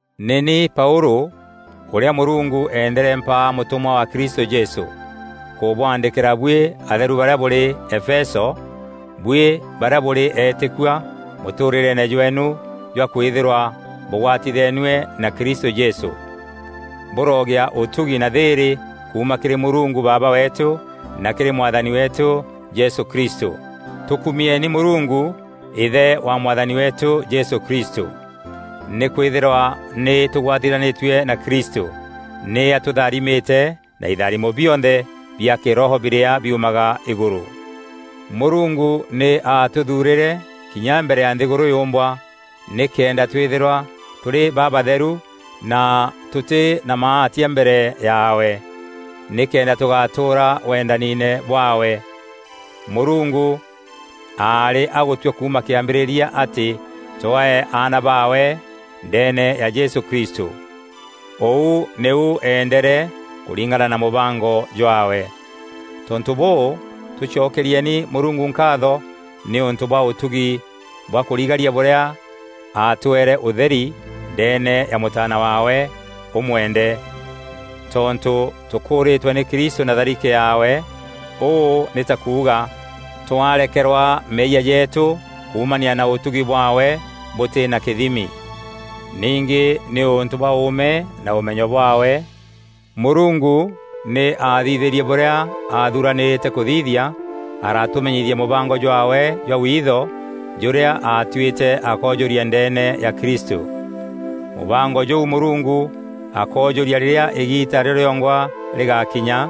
Nî ni Paûlû, ûrîa Mûrungu endere mpaa mûtûmwa wa Kristû Jesû, nkûbwaandîkîra buî atheru barîa bûrî Efeso, buî barîa bûrî eetîkua mûtûûrîreene jweenu jwa kwîthîrwa bûgwatitheenue na Kristû Jesû. Bûrogîa ûtugi na thîîrî kuuma kîrî Mûrungu Baaba weetû na kîrî Mwathani weetû Jesû Kristû. Tûkumieeni Mûrungu, Îthe wa Mwathani weetû Jesû Kristû. Nîkwîthîrwa nî tûgwatithanîtue na Kristû, nî atûtharimîte na itharimo bionthe bia kîroho birîa biumaga îgûrû. Mûrungu nî aatûthuurîre kinya mbere ya nthîgûrû yûmbwa, nîkenda twîthîrwa tûrî babatheru na tûtî na maatia mbere yaawe. Nîkenda tûgatûûra wendaniine bwaawe, Mûrungu aarî agûtua kuuma kîambîrîria atî twee aana baawe ndeene ya Jesû Kristû. Ûu nîu eendere kûringana na mûbango jwaawe. Tontû bûû, tûcokerieni Mûrungu nkaatho nîûntû bwa ûtugi bwa kûrigaria bûrîa aatweere ûtheri ndeene ya Mûtaana waawe ûmwende. Tontû tûkûûrîtwe nî Kristû na tharike yaawe; ûû nî ta kuuga, twarekeerwa meeyia jeetû kuumania na ûtugi bwaawe bûtî na kîthimi. Ningî nîûntû bwa ûûme na ûmenyo bwaawe, Mûrungu nî aathithîrie bûrîa aathuranîrîte kûthithia, aratûmenyithia mûbango jwaawe jwa witho jûrîa aatuîte akoojûria ndeene ya Kristû. Mûbango jûu Mûrungu akoojûria rîrîa îgiita rîo rîongwa rîgakinya,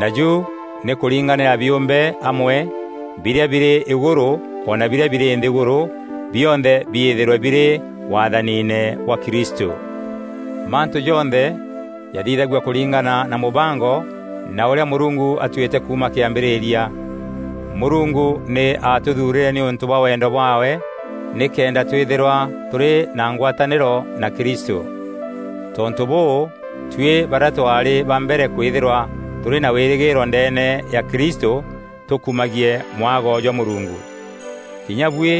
naju nî kûringanîra biûmbe amwe, birîa birî îgûrû o na birîa birî nthîgûrû, bionthe biîthîrwe birî waathaniine bwa Kristû. Mantû jonthe jathithagua kûringana na mûbango na ûrîa Mûrungu atuîte kuuma kîambîrîria. Mûrungu nî atûthurîre nîûntû bwa wendo bwaawe nîkenda twîthîrwa tûrî na ngwatanîro na Kristû. Tontû bûû, tuî barîa twaarî ba mbere kwîthîrwa tûrî na wîrîgîîro ndeene ya Kristû tûkumagie mwago jwa Mûrungu. Kinya buî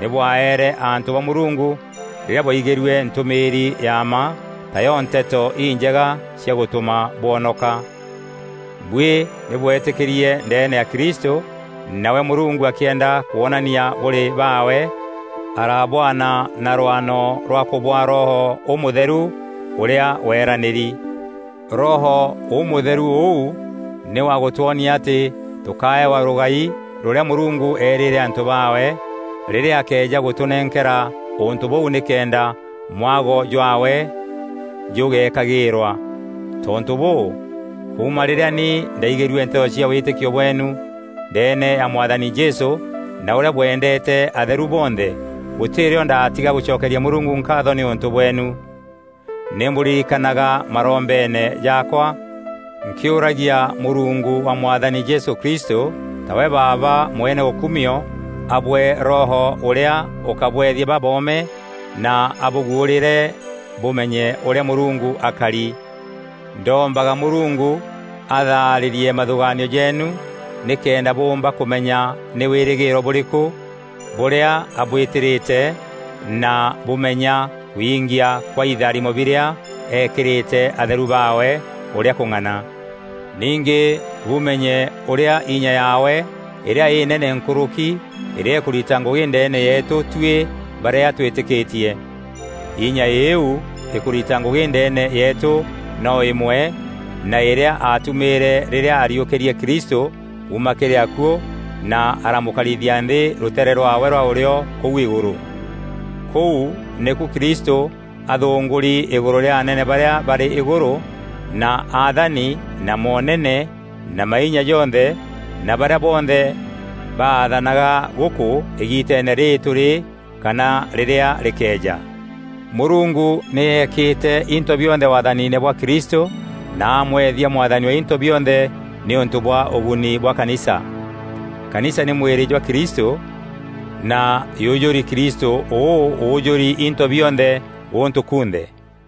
nî bwaeere antû ba Mûrungu rîrîa bwaigîrue ntûmîîri ya mma, tayo Nteto Injega cia gûtûma bwonoka. Buî nî bwetîkîrie ndeene ya Kristû, nawe Mûrungu akîenda kwonania bûrî baawe, arabwana na rwano rwa kûbwaa Roho Ûmûtheru ûrîa weeranîri. Roho Ûmûtheru ûu nî wa gûtwonia atî tûkaewa rûgai rûrîa Mûrungu eerîîre antû baawe, rîrîa akeeja gûtûnenkera ûntû bûu nîkenda mwago jwaawe jûgekagîîrwa. Tontû bûû, kuuma rîrîa ni ndaaîgîrue nteto cia wîtîkio bweenu ndeene ya Mwathani Jesû na ûrîa bwendeete atheru bonthe, gûtî rîo ndaatiga gûcokeria Mûrungu nkaatho nîûntû bweenu. Nî mbûririkanaga marombeene jaakwa, nkîûragia Mûrungu wa Mwathani Jesû Kristû, tawe Baaba mwene ûkumio, abwee Roho ûrîa ûkabwethia baboome na abûguûrîîre bûmenye ûrîa Mûrungu akari. Ndombaga Mûrungu athaarîrie mathûgaanio jeenu nîkenda bûûmba kûmenya nî wîrîgîîro bûrîkû bûrîa abwîtîrîte na bûmenya kwingîa kwa itharimo birîa ekîrîte atheru baawe ûrîa kûng'ana. Ningî bumenye ûrîa inya yaawe îrîa înene nkûrûki îrîa îkûrita ngûgî ndeene yeetû tuî barîa twîtîkîtie. Inya îîu îkûrita ngûgî ndeene yeetû no îmwe na îrîa aatumîîre rîrîa ariûkîrie Kristû kuuma kîrî akuû na aramûkarithia nthî rûteere rwaawe rwa ûrîo kûu îgûrû. Kûu nîku Kristû athûngûûri îgûrû rîa anene barîa barî îgûrû, na athani na moonene na mainya jonthe, na barîa bonthe baathanaga gûkû îgiiteene rîrî tûrî kana rîrîa rîkeeja. Mûrungu nî eekîte into bionthe waathaniine bwa Kristû na amweethia Mwathani wa into bionthe nîûntû bwa ûguni bwa kanisa. Kanisa nî mwîrî jwa Kristû, na yûjûrî Kristû ûû ûjûri into bionthe gûntû kunthe.